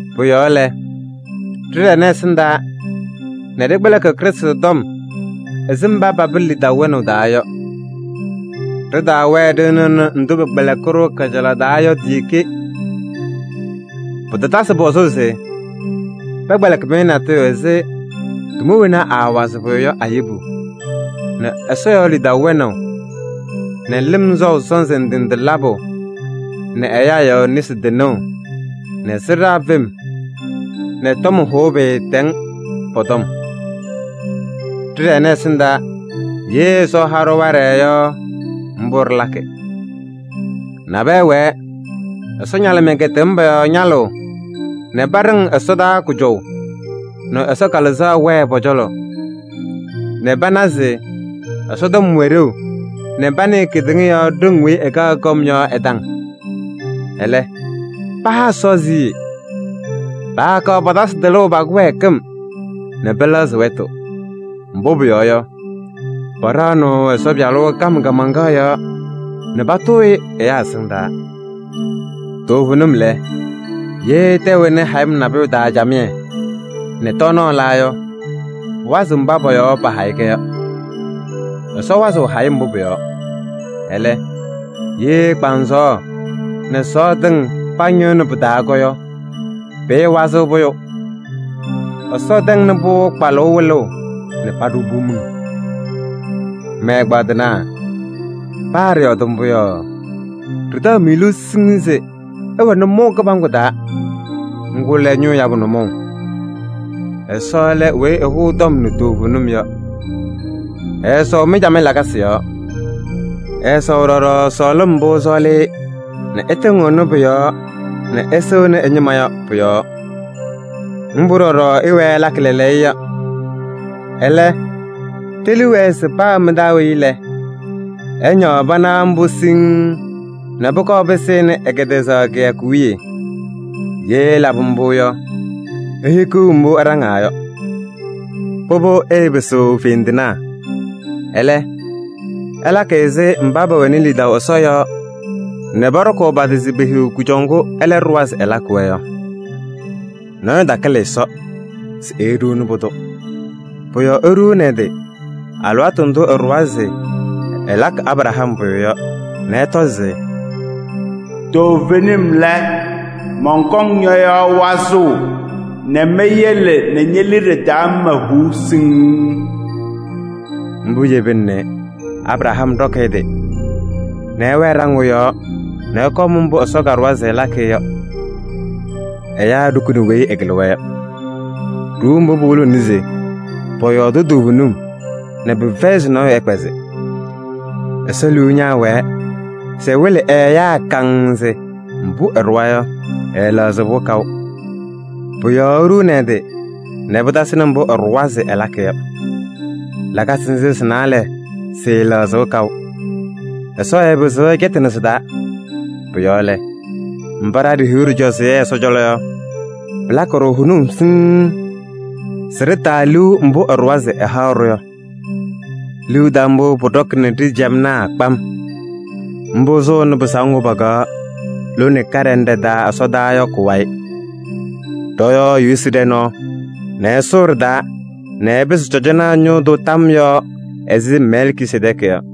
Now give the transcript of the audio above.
Pʋ-yɔɔ lɛ, ɖɩɖɛnɩ ɛsɩndaa nɛ ɖɩkpɛlɩkɩ Krɩstʋ tɔm ɛzɩ mba papɩ lidaʋ wɛnaʋ taa yɔ. Ɖɩtaawɛɛ ɖɩnɩɣnɩ ndʋ pɛkpɛlɩkɩ-ɖʋ kajalaɣ taa yɔ ti-ɖeke. Pɩtatasɩ pɔzʋʋ se pɛkpɛlɩkɩ-mɩ natʋyʋ ɛzɩ: tʋma wena aawazɩɣ pʋyʋ yɔ a-yebu nɛ Ɛsɔ yɔɔ lidaʋ wɛnaʋ nɛ lɩm sɔʋ sɔnzɩ ndɩ ndɩ labʋ nɛ ɛyaa yɔɔ nesi tɩnʋʋ nɛ sɩɖaa fem nɛ tɔm hʋʋ pɩɩtɛŋ, pɔ-tɔm. Ɖɩɖɛnɩ ɛsɩndaa! Ye Ɛsɔ ɛha-ɖʋ waɖɛ yɔ, mbʋ ɖɩlakɩ. Nabɛyɛ wɛɛ, Ɛsɔ ñalɩmɩyɛ kɛtɛm pɔ-yɔɔ ñalʋʋ nɛ paɖɩŋ ɛsɔdaa kʋjɔʋ nɛ Ɛsɔ Kalɩzaɣ wɛɛ pɔ-cɔlɔ nɛ pana se Ɛsɔtɔm wɛ ɖeu nɛ panɩɩ kedeŋa ɖoŋ weyi ɛkaɣ kɔm yɔ ɛ-taŋ. Ɛlɛ, paha Ɛsɔ siɣye. Paakaɣ patasɩ tɩlʋʋ pa-kɩwɛɛkɩm nɛ pɛlɛɣzɩ wɛtʋ. Mbʋ pʋyɔɔ yɔ, paɖaɣnɩɣ Ɛsɔ Pɩyalʋ kam kaamaŋkaɣ yɔɔ nɛ patʋʋ-ɩ ɛyaa ɛsɩndaa. Toovenim lɛ, ye tɛʋ ɛnɩ hayɩm nabʋyʋ taa camɩyɛ nɛ tɔɔnaɣ la yɔ, pʋwazɩ mba pɔ-yɔɔ pahayɩ-kɛ yɔ. Ɛsɔ wazɩɣ hayɩm mbʋ pʋ-yɔɔ. Ɛlɛ, ye kpaŋsɔɔ nɛ sɔɔ tɩŋ pañɩɣnɩ pɩ-taa yɔ, pɩɩwazɩɣ pʋyʋ. Ɛsɔ tɛŋnɩ-pʋ kpalʋʋ wɩlʋʋ nɛ paɖʋ-pʋ miŋ. Mɛ-ɛgbaadɩnaa! Paa ɖɩyɔɔdɩ mbʋ yɔ, ɖɩtaɣ-mɩ liu siŋŋ se ɩwɛ nʋmɔʋ kɩbaŋgʋ taa, ŋgʋ lɛ ñʋʋ yabʋ nʋmɔʋ. Ɛsɔ lɛ weyi ɛhʋʋ tɔm nɛ toovenim yɔ. Ɛɛsɔʋ mɩ-camɩyɛ lakasɩ yɔɔ. Ɛɛsɔʋ ɖɔɖɔ sɔɔlɩm mbʋ ɩsɔɔlɩ-ɩ nɛ ɩtɩŋɩɣnɩ pʋ-yɔɔ nɛ ɩsɩŋnɩ ɛ-ñɩma yɔ pʋyɔɔ. Mbʋ ɖɔɖɔ ɩwɛɛ ɩlakɩ lɛɛlɛɛyɔ. Ɛlɛ, ɖe-liu wɛɛ se paa mɩ-taa weyi lɛ, ɛñaɣ pana mbʋ siŋŋ nɛ pʋkɔɔ pɩsɩnɩ ɛ-kɛtɛzaɣ kɩyakʋ wiye. Ye ɩlabɩ mbʋ yɔ, ihikiɣ mbʋ ɩɖaŋaa yɔ. Pʋbʋ, ɩɩpɩsɩɣ fendinaa. Ɛlɛ, ɩlakɩ ɛzɩ mba pɛwɛnɩ lidaʋ Ɛsɔ yɔɔ nɛ pɔɖɔkʋʋ pa-tɩ se pehiɣ kʋjɔʋ ŋgʋ ɛlɛ ɖʋwa se ɛlakɩ-wɛ yɔ. Nɔɔyʋ takɩlɩ Ɛsɔ se eeɖuuni pʋdʋ. Pʋ-yɔɔ eɖuuni ɛ-tɩ alɩwaatʋ ndʋ ɛɖʋwa se ɛlakɩ Abraham pʋyʋ yɔ nɛ ɛtɔ se: “Toovenim lɛ, mɔnkɔŋ ñɔ-yɔɔ wazʋʋ nɛ meyele ñe-liɖe taa ñɩma huu siŋŋ.” Mbʋ yebina nɛ Abraham ɖɔkɩ ɛ-tɩ nɛ ɛwɛɛ ɖaŋʋʋ yɔɔ nɛ ɛkɔɔ ɛmʋ mbʋ Ɛsɔ kaɖʋwa se ɛlakɩ-ɩ yɔ. Ɛyaa ɖukuni weyi ɛkɩlɩ-wɛ yɔ. Ɖuuu mbʋ pɩwɩlɩɣnɩ se pɔyɔɔdɩ toovenim nɛ pɩfɛyɩ se nɔɔyʋ ɛkpɛzɩ. Ɛsɔ liu ñaawɛɛ se ɛwɩlɩ ɛ-ɛyaa kaŋŋ se mbʋ ɛɖʋwa yɔ, ɛɛlɛɣzɩ-pʋ kaʋ. Pʋ-yɔɔ eɖuuni ɛ-tɩ nɛ pɩtasɩnɩ mbʋ ɛɖʋwa se ɛlakɩ yɔ. Lakasɩ nzɩ sɩ-naalɛ sɩɩlɛɣzɩɣ kaʋ. Ɛsɔ ɛɛpɩzɩɣ ɛcɛtɩnɩ sɩ-taa. Pʋ-yɔɔ lɛ, mba ɖa ɖihiɣ ɖɩcɔzɩyɛ Ɛsɔ cɔlɔ yɔ, pɩlakɩ-ɖʋ hʋnʋm siŋŋ se ɖɩtaa liu mbʋ ɛɖʋwa se ɛhaɣ-ɖʋ yɔ. Liu taʋ mbʋ pʋɖɔkɩnɩ ɖa-ciyamnaa kpam. Mbʋ sʋʋnɩ pɩsaʋ ŋgʋ pakaɣ lone kaɖɛ ñɩnɖɛ taa ɛsɔdaa yɔ kʋ-wayɩ. Ɖɔ-yɔɔ Yesu ɖɛ nɔɔ nɛ ɛsʋʋ ɖɩ-taa nɛ ɛpɩsɩ cɔjɔnaa ñʋʋ tʋ tam yɔɔ ɛzɩ Mɛlkisedɛɛkɩ yɔ.